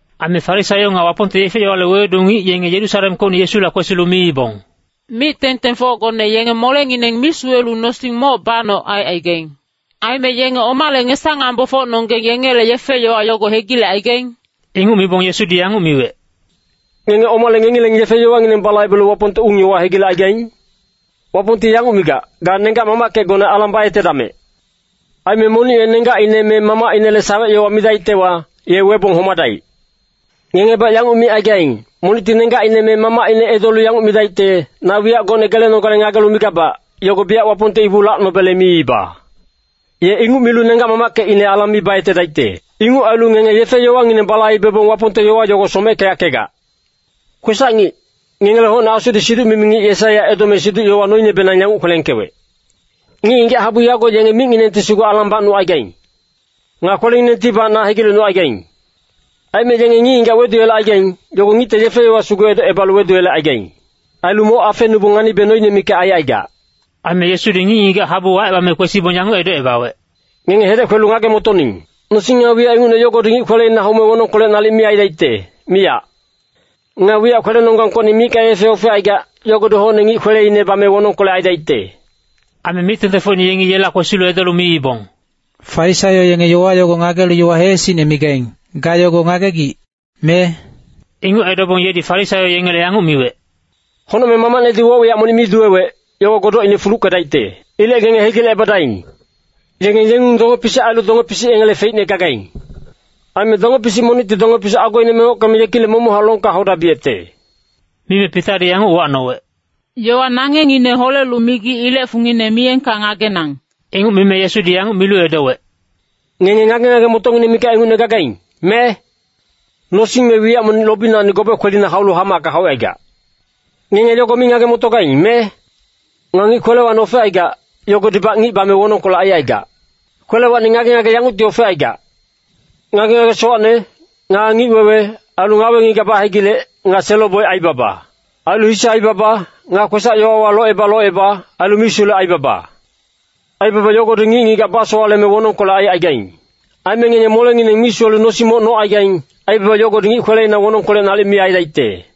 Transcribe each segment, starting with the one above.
Aime Farisaio nga Wapongte yefe-yowale wewedu ngic yenge Yerusalemkocni Yesula kwesilu miibong, “Mic-tengtengfocgone yenge molengineng mi suwelu nosing moc banoc aicaigaing. Aime yenge omale ngesa-ngambofocnonggeng yengele yefe-yowa yogo hegilecaigaing?” Inguc mibong Yesudi yanguc miwec, “Ngenge omale ngengileng yefe-yowangineng balaibelu Wapongte ung-yowa hegilecaigaing? Wapongti yanguc migac, ‘Ga nenggac-mamackecgone alang bayetedamec.’ Aime ‘Monic ye nenggacine me mamacinele sawec-yowa midaictewa, ye webong homadaic.’ Ngengebac yanguc micaigaing, ‘Monicti nenggacine me mamacine edolu yanguc midaicte, “Na wiyac gocne gelenogale ngagelu migabac, yogo biyac Wapongte ibu lacnobele miiba.” ’ Ye inguc milu nenggac-mamackecine alang mi bayetedaicte. Inguc ailu ngenge yefe-yowangineng balaibebong Wapongte yowa yogo someckeyackegac. Kwesac-ngic, ngengele hocne Asudi siduc-mimi ngic Yesaiya edome siduc-yowa noinebenang yanguc kwelengkewec, ‘Ngic-ngigac habu yago yenge micnginengti sugu alang bacnucaigaing. Nga kwelenginengtibac na hegilecnucaigaing. Aime yenge ngic-ngigac weduyelecaigaing, yogo ngicte yefe-yowa sugu edocebalu weduyelecaigaing. Ailu moc afenubong nganibe noine mikac aicaigac.’” Aime Yesudi ngic-ngigac habu wacebame kwesibong yanguc edocebawec, “Ngenge hedec kwelu ngage-motoning. Nosing nga wiyac ingucne yogodi ngic kweleina haume wonongkolec nalic mi aidaicte, miyac. Nga wiyac kwelenonggangkocni micka yefe ofecaigac, yogodi hocne ngic kweleine bame wonongkolec aidaicte.” Aime mic-tengtengfocine yengi yela kwesilu edolu miibong, “Farisaio yenge yowa yogo ngagelu yowa heesicne migaing, ga yogo ngagegic, me?” Inguc edobong yedi Farisaio yengele yanguc miwec, “Honocmeng Mamacnedi woc-wiyac monic mi duwewec, yogo godocine fuluckedaicte. Ilec ngenge hegilecebadaing. Yenge yengung donge-pisic ailu donge-pisic yengele feicne gagaing. Aime donge-pisic monicti donge-pisic agoine mengockeme yekilec momochac longka haudabiyecte.” Mime Pitadi yanguc uwacnowec, “Yowa nangengngine holelu migic ilec fungine miyengka ngagenang.” Inguc mime Yesudi yanguc milu edowec, “Ngenge ngage-ngage-motocngineng mikac ingucne gagaing, me? Nosing me wiyac monic lobinacni gobe kwelina haulu hamacka haucaigac. Ngenge yogo mi ngage-motogaing, me? Nga ngic kwelewacni ofecaigac, yogodibac ngic bame wonongkolec aicaigac. Kwelewacni ngage-ngage yangucti ofecaigac. Ngage-ngage sowacne, nga ngic-wewe, ailu ngawe-ngigac bahegilec, nga selo-boic aibaba. Ailu hise aibaba, nga kwesac-yowawa loceba-loceba, ailu misulec aibaba. Aibaba yogodi ngic-ngigac basowaleme wonongkolec aicaigaing. Aime ngenge molengineng mi suwelu nosing moc nocaigaing, aibaba yogodi ngic kwelewa wonongkolec nalic mi aidaicte.”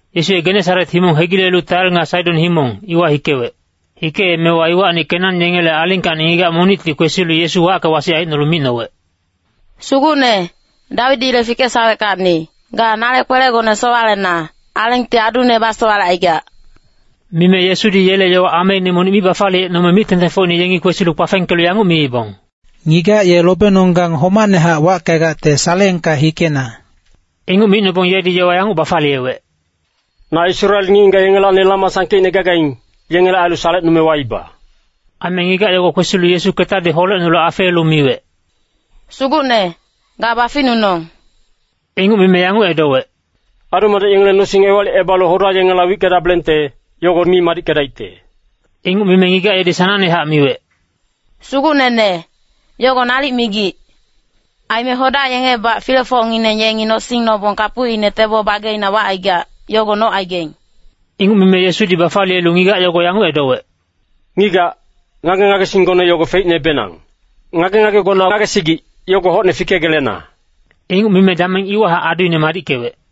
Yesu ye Genesaret himong hegilelu Tair nga Saidon himong, iwa hikewec. Hikeemewa iwacni Kenan yengele alingkacni ngigac monicti kwesilu Yesu wacke-wasic aicnolu micnowec, “Sugucne, Dawidile fikesaweckacni, ga nale kwelegone sowalena, alengti adune basowalecaigac.” Mime Yesudi yele yowa ameine monic mi bafaliyecnome mic-tengtengfocine yengi kwesilu kpafengkelu yanguc miibong, “Ngigac ye lobenonggang homacnehac wackegacte saleengka hikena.” Inguc micnobong yedi yowa yanguc bafaliyewec, “Na Israel ngic-ngigac yengelacni lama sangkeicne gagaing, yengele ailu salecnume waiba.” Aime ngigac yogo kwesilu Yesu ketadi holecnolu afeelu miwec, “Sugucne, ga baficnunong.” Inguc mime yanguc edowec, “Adu-madec yengele nosing ewalicebalu hoda yengela wickedabelengte, yogo mi madickedaicte.” Inguc mime ngigac yedi sanangnehac miwec, “Sugucnene, yogo nalic migic. Aime hoda yengebac filefocngineng yengi nosing nobong kapucine tebo bageina wacaigac, yogo nocaigaing.” Inguc mime Yesudi bafaliyelu ngigac yogo yanguc edowec, “Ngigac, ngage-ngagesinggone yogo feicnebenang. Ngage-ngagegona ngagesigic, yogo hocne fikegelena.” Inguc mime dameng iwahac aduine madickewec.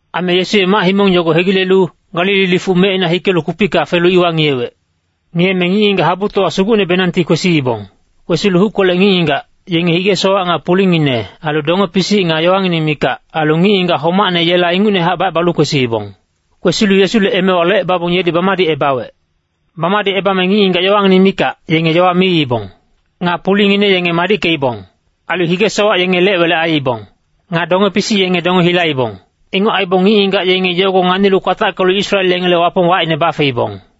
Aime Yesu ye mac-himong yogo hegilelu, Galili lifuc mecina hikelu kupicka felu iwa ngiyewec. Ngiyeme ngic-ngigac habutowa sugucnebenangti kwesiibong. Kwesilu huckolec ngic-ngigac, yenge hige-sowac nga pulingine, ailu donge-pisic nga yowangineng mikac, ailu ngic-ngigac homacne yela ingucnehac bacebalu kwesiibong. Kwesilu Yesule emewa locebabong yedi bamadicebawec. Bamadicebame ngic-ngigac yowangineng mikac, yenge yowa miibong. Nga pulingine yenge madickeibong. Ailu hige-sowac yenge lec-welec aiibong. Nga donge-pisic yenge donge hilaibong. Inguc aibong ngic-ngigac yenge yogo nganilu kwatackelu Israel yengele Wapong wacine bafeibong.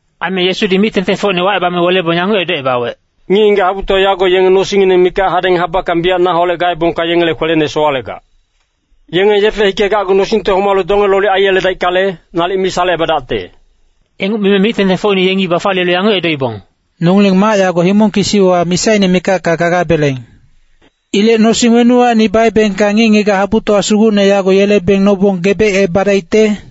Aime Yesudi mic-tengtengfocine wacebame welebong yanguc edocebawec, “Ngic-ngigac habutowa yago yenge nosingngineng mikac hadeng habackang biyac naholec gaebongka yengele kwelene sowalegac. Yenge yefe hikegacgu nosingte homalu donge lolic aiyeledaickale, nalic mi salecebadacte.” Inguc mime mic-tengtengfocine yengi bafaliyelu yanguc edoibong, “Nongileng mac yago himong kisiwa misaine mikacka gagabeleng. Ilec nosing wenuwacni baebengka ngic-ngigac habutowa sugucne yago yelebeng nobong gebecebadaicte?”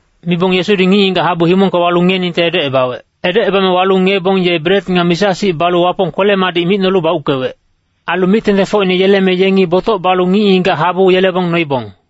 Mibong Yesudi ngic-ngigac habu himongka walu ngiyeningte edocebawec. Edocebame walu ngiyebong ye bret nga misa-sic balu Wapong kwele-madic micnolu bauckewec. Ailu mic-tengtengfocine yeleme yengi botoc balu ngic-ngigac habu yelebong noibong.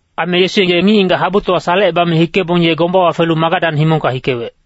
Aime Yesu ye ngic-ngigac habutowa salecebame hikebong ye gombawa felu Magadan himongka hikewec.